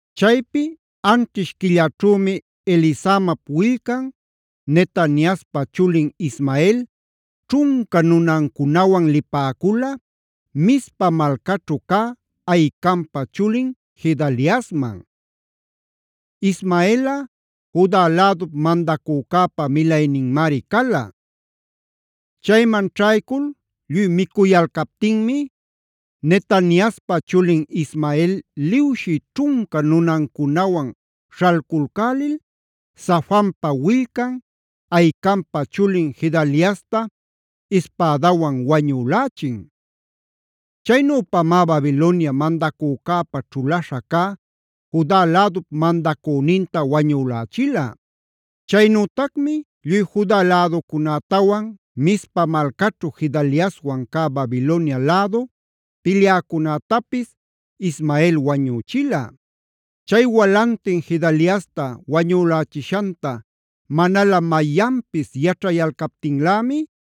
Chaypi anćhish quillaćhümi Elisamap willcan, Netaniaspa chulin Ismael ćhunca nunancunawan lipäcula Mizpa malcaćhu cä Ahicampa chulin Gedaliasman. Ismaelꞌa Juda lädup mandacücäpa milayninmari cala. Chayman ćhaycul lluy micuyalcaptinmi, Netaniaspa chulin Ismael liwshi ćhunca nunancunawan śhalculcälil Safanpa willcan, Ahicampa chulin Gedaliasta ispädawan wañülächin. Chaynüpamá Babilonia mandacücäpa ćhulaśha cä Juda lädup mandacüninta wañülächila. Chaynütacmi lluy Juda läducunätawan Mizpa malcaćhu Gedaliaswan cä Babilonia lädu pilyäcunätapis Ismael wañüchila. Chay walantin Gedaliasta wañülächishanta manalä mayanpis yaćhayaptinlämi,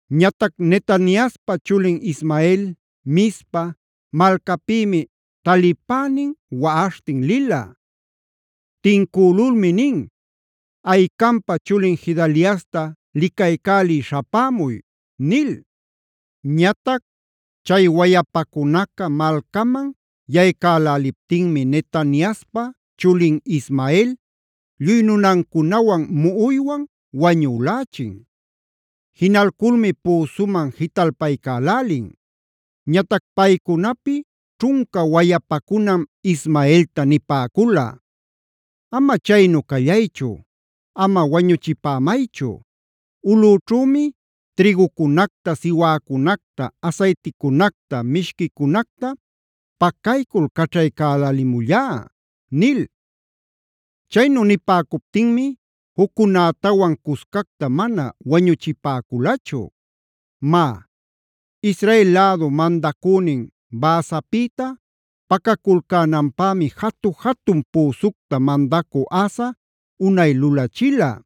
Ñatac Netaniaspa chulin Ismael, Mizpa malcapïmi talipänin waꞌaśhtin lila. Tincülulmi nin: “Ahicampa chulin Gedaliasta licaycälï śhapämuy” nil. Ñatac chay wayapacunaca malcaman yaycäläliptinmi Netaniaspa chulin Ismael lluy nunancunawan muꞌuywan wañülächin. Jinalculmi püsuman jitalpaycälälin. Ñatac paycunapi ćhunca wayapacunam Ismaelta nipäcula: “Ama chaynu callaychu, ama wañuchipämaychu. Ulꞌućhümi trïgucunacta, siwäcunacta, asayticunacta, mishquicunacta pacaycul caćhaycälälimullá” nil. Chaynu nipäcuptinmi juccunätawan cuscacta mana wañuchipäculachu. Má, Israel lädu mandacünin Baasapïtaa pacaculcänanpämi jatu-jatun püsucta mandacü Asa unay lulachila.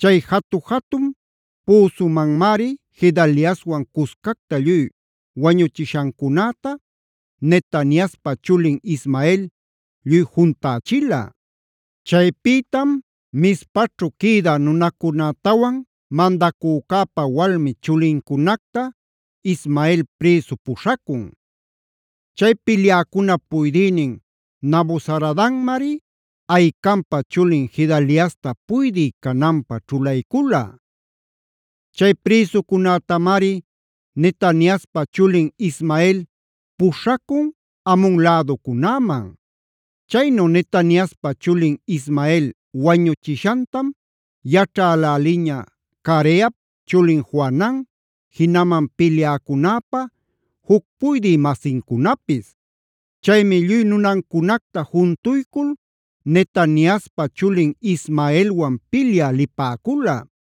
Chay jatu-jatun püsumanmari Gedaliaswan cuscacta lluy wañuchishancunäta, Netaniaspa chulin Ismael lluy juntächila. Chaypïtam Mizpaćhu quïdä nunacunätawan mandacücäpa walmi chulincunacta Ismael prïsu puśhacun. Chay pilyäcunap puydïnin Nabuzaradanmari Ahicampa chulin Gedaliasta puydï cananpä ćhulaycula. Chay prïsucunätamari Netaniaspa chulin Ismael puśhacun Amon läducunäman. Chaynu Netaniaspa chulin Ismael wañuchishantam yaćhäläliña Careap chulin Johanan, jinaman pilyäcunäpa juc puydï-masincunapis. Chaymi lluy nunancunacta juntuycul Netaniaspa chulin Ismaelwan pilyä lipäcula.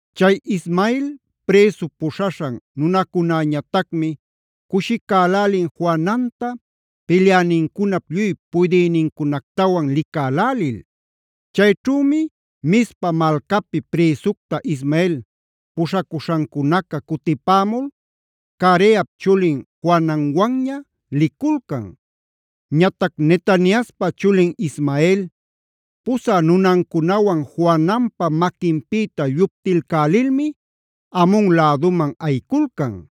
Chay Ismael prïsu puśhaśhan nunacunäñatacmi cushicälälin Johananta, pilyänincunap lluy puydïcunactawan licälälil. Chayćhümi Mizpa malcapi prïsucta Ismael puśhaśhancunaca cutipämul Careap chulin Johananwanña liculcan. Ñatac Netaniaspa chulin Ismael, pusä nunancunawan Johananpa maquinpïta lluptilcälilmi Amon läduman ayiculcan.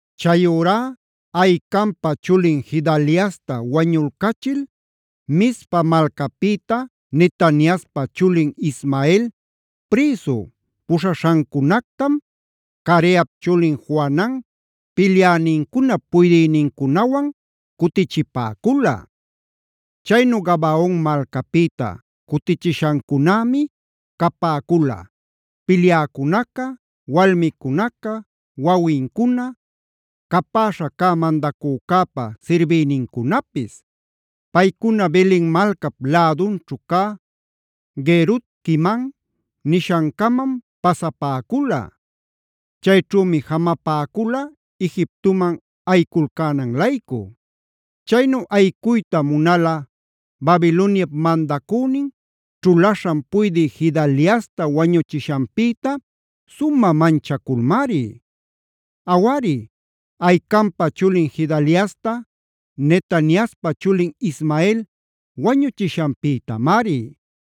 Chayurá Ahicampa chulin Gedaliasta wañulcachil Mizpa malcapïta Netaniaspa chulin Ismael prïsu puśhaśhancunactam, Careap chulin Johanan pilyänincunap puydïnincunawan cutichipäcula. Chaynu Gabaon malcapïta cutichishancunämi capäcula: pilyäcunaca, walmicunaca, wawincuna, capäśha cä mandacücäpa sirbïnincunapis. Paycuna Belen malcap lädunćhu cä Guerut-quimam nishancamam pasapäcula. Chayćhümi jamapäcula Egiptoman ayiculcänan-laycu. Chaynu ayicuyta munala Babiloniap mandacünin, ćhulaśhan puydï Gedaliasta wañuchishanpïta sumä manchaculmari; awari, Ahicampa chulin Gedaliasta, Netaniaspa chulin Ismael wañuchishanpïtamari.